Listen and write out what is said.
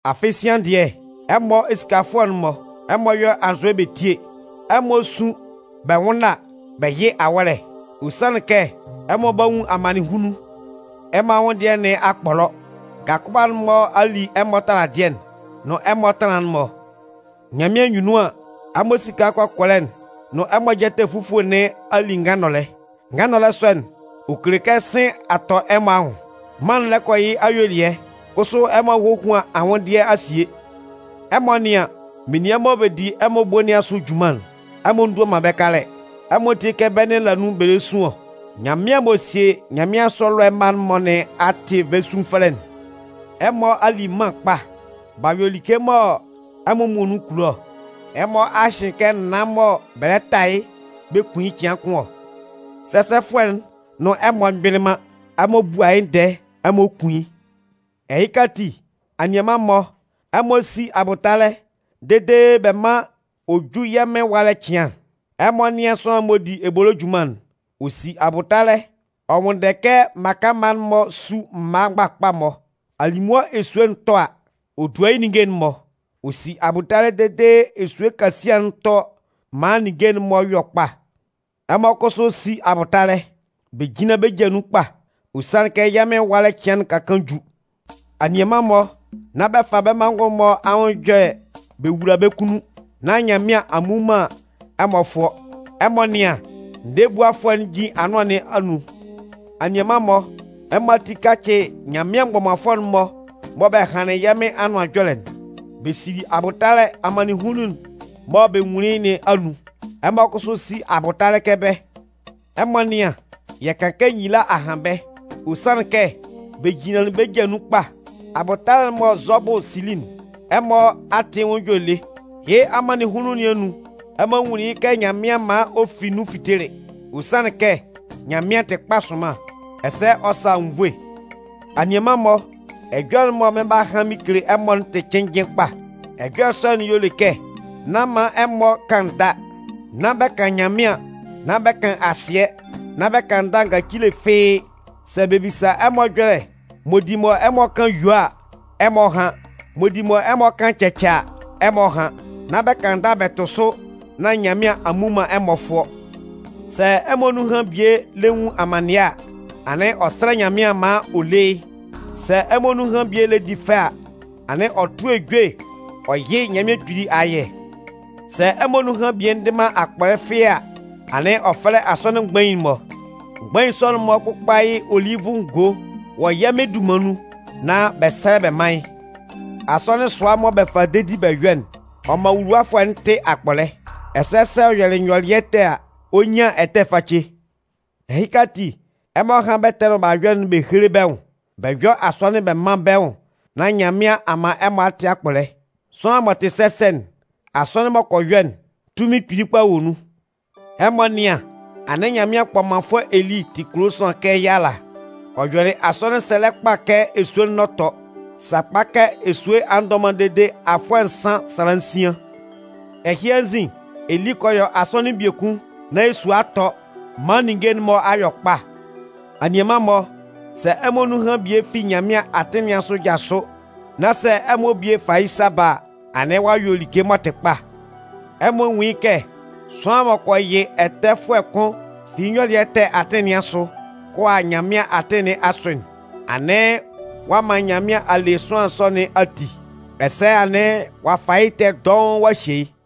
Afɩ sian dɩɛ, ɛmɔ esikafʋɛ'n-mɔ, ɛmɔ yɔ́ anzʋɛ bɛ tíe! Ɛmɔ sún bɛ nwʋ́nna bɛ yɩ́ awɔ́lɛ. Ɔ sanlɩn kɛ ɛmɔ 'ba nwun amannɩnhunnun. Ɛmɔ anwʋnndɩɛ nɩn a kpɔlɔ. Ngakʋba'n-mɔ a li ɛmɔ taladɩɛ'n nʋn ɛmɔ ɛtanlan'n-mɔ. Nyanmɩan anyunnun an, ɛmɔ esika kɔkɔlɛ'n nʋn ɛmɔ jɛtɛ fufue nɩn a li ngannɔlɛ. Ngannɔlɛ sɔ'n, ɔ kele kɛ sɩ̂n a tɔ ɛmɔ anwʋn. Mân'n lɛ kɔ yɩ́ ayuelɩɛ, kʋsʋ ɛmɔ a hohuan anwʋndɩɛ a sie! Ɛmɔ nɩ́an, menian mɔ bɛ di ɛmɔ ebo nɩn asʋ junman'n, ɛmɔ ndua man bɛ́ kalɛ. Ɛmɔ tíe kɛ bɛ́ nɩn la nun bɛ lɛ sun ɔ. Nyanmɩan m'ɔ sie nyanmɩansʋ ɛlɔɛ mma'n-mɔ nɩn a tɩ bɛ́ sunfɛlɛ'n. Ɛmɔ a li mân kpa, b'a yɔ like mɔ ɛmɔ muonun kulo ɔ. Ɛmɔ a hɩn kɛ naan mɔ bɛ lɛ ta yɩ́ bɛ kun yɩ́ cɩan kʋn ɔ. Sɛsɛfʋɛ'n nʋn ɛmɔ mgbɩlɩ man, ɛmɔ bua yɩ́ ndɛɛ, ɛmɔ kun yɩ́. Ɛhɩka ati, anianman-mɔ, ɛmɔ sí abʋtalɛ dede bɛ mán ɔ jú yɛ́ Mɩn ɛwalɛ cɩan. Ɛmɔ nɩ́an sʋanlan m'ɔ di ebolo junman'n, ɔ si abʋtalɛ ɔ nwʋnndɛ kɛ mmaka mma'n-mɔ sú mma mgbakpa-mɔ. Alimʋa esue'n tɔ a, ɔ dua yɩ́ ninnge'n-mɔ, ɔ si abʋtalɛ dede esue kasian'n tɔ maan ninnge'n-mɔ yɔ kpa. Ɛmɔ kʋsʋ sí abʋtalɛ, bɛ jínlan bɛ́ ja nun kpa. Ɔ sanlɩn kɛ yɛ́ Mɩn ɛwalɛ cɩan'n ka kaan ju. Anianman-mɔ, nán bɛ fa bɛ́ manngʋn'n-mɔ anwʋn ɛjɔlɛ bɛ wula bɛ́ kunnun, nán Nyanmɩan a mmu man ɛmɔ fʋɔ. Ɛmɔ nɩ́an, ndɛɛbuafʋɛ'n jin anʋan nɩn anun. Anianman-mɔ, ɛmɔ ati kácɩ Nyanmɩan mgbɔmanfʋɛ'n-mɔ mɔ bɛ hanlɩn yɛ́ Mɩn Anʋan Ɛjɔlɛ'n. Bɛ sili abʋtalɛ amannɩnhunnun'n mɔ bɛ nwunlin yɩ́ nɩn anun. Ɛmɔ kʋsʋ sí abʋtalɛ kɛ bɛ́. Ɛmɔ nɩ́an, yɛ kan kɛ nyila a han bɛ́, ɔ sanlɩn kɛ bɛ jinlanlɩn bɛ́ ja nun kpa. Abʋtalɛ'n m'ɔ Zɔbʋ sili'n, ɛmɔ a tɩ yɩ́ nwʋn ɛjɔlɛ lé. Yɩ́ amannɩnhunnun nɩn anun, ɛmɔ nwunlin yɩ́ kɛ Nyanmɩan man ɔ fi nun fitelɩ. Ɔ sanlɩn kɛ Nyanmɩan tɩ kpa sʋnman, ɛsɛ ɔ sa anwunnvoe. Anianman-mɔ, ɛjɔlɛ'n mɔ mɩn 'ba han mɩn kele ɛmɔ'n tɩ cɩnnjɩn kpa. Ɛjɔlɛ sɔ'n y'ɔ le kɛ nán man ɛmɔ kan ndâ. Nán bɛ kan Nyanmɩan, nán bɛ kan asɩɛ, nán bɛ kan ndâ ngacile fɩ́ɩ́. Sɛ bɛ bisa ɛmɔ ɛjɔlɛ m'ɔ di mɔ ɛmɔ kan: “Yuo” a, ɛmɔ hán. M'ɔ di mɔ ɛmɔ kan: “Cɛcɛ” a, ɛmɔ hán. Nán bɛ kan ndâ bɛ tʋ sʋ nán Nyanmɩan a mmu man ɛmɔ fʋɔ. Sɛ ɛmɔ nunhan bie lɛ nwun amannɩɛ a, anɩn ɔ sɛ́lɛ Nyanmɩan maan ɔ lé yɩ́. Sɛ ɛmɔ nunhan bie lɛ di fɛ a, anɩn ɔ tʋ́ ejue ɔ yɩ́ Nyanmɩan Kpili ayɛ. Sɛ ɛmɔ nunhan bie ndɩ man akpɔlɛ fɩ́ɩ́ a, anɩn ɔ fɛ́lɛ asɔnɩn mgbain'n-mɔ. Mgbain sɔ'n-mɔ kpʋ́kpa yɩ́ olivʋ ngo wɔ yɛ́ Mɩn dunman nun nán bɛ sɛ́lɛ bɛ mán yɩ́. Asɔnɩn sʋa mɔ bɛ fa dedi bɛ yɔ'n, ɔ man wuluwafʋɛ'n tɩ akpɔlɛ. Ɛsɛ sɛ ɔ yɔlɩ nyɔlɩɛ ɛtɛ a, ɔ 'nyan ɛtɛ face. Ɛhɩka ati, ɛmɔ hán bɛ́ ɛtɛ'n-mɔ mɔ b'a yɔ'n bɛ héle bɛ́ nwʋn, bɛ yɔ́ asɔnɩn bɛ mán bɛ́ nwʋn nán Nyanmɩan a man ɛmɔ a tɩ akpɔlɛ. Sʋanlan m'ɔ tɩ sɛsɛ'n, asɔnɩn m'ɔ kɔ yɔ'n, tunmin kpili kpa wɔ nun. Ɛmɔ nɩ́an, anɩn Nyanmɩan kpɔmanfʋɛ Eli tɩ kulo sʋanlan kɛ yɛ́ ala. Ɔ yɔlɩ asɔnɩn sɛlɛ kpa kɛ esue'n n'ɔ tɔ. Sakpa kɛ esue a ndɔ man dede afʋɛ nsan sala nsian. Ɛhɩ anzin, Eli kɔ yɔ asɔnɩn biekun nán esue a tɔ maan ninnge'n-mɔ a yɔ kpa. Anianman-mɔ, sɛ ɛmɔ nunhan bie fi Nyanmɩan atɩn nɩn asʋ jasʋ, nán sɛ ɛmɔ bie fa yɩ́ sa ba a, anɩn ɔ'a yɔ like m'ɔ tɩ kpa. Ɛmɔ nwún yɩ́ kɛ sʋanlan m'ɔ kɔ yɩ ɛtɛfʋɛ kʋn fi yɩ́ nyɔlɩɛ ɛtɛ atɩn nɩn asʋ kɔ a Nyanmɩan atɩn nɩn asʋ'n, anɩn ɔ a man Nyanmɩan a le sʋanlan sɔ nɩn ati, ɛsɛ anɩn ɔ'a fa yɩ́ ɛtɛ'n dɔʋn ɔ'a hye yɩ́.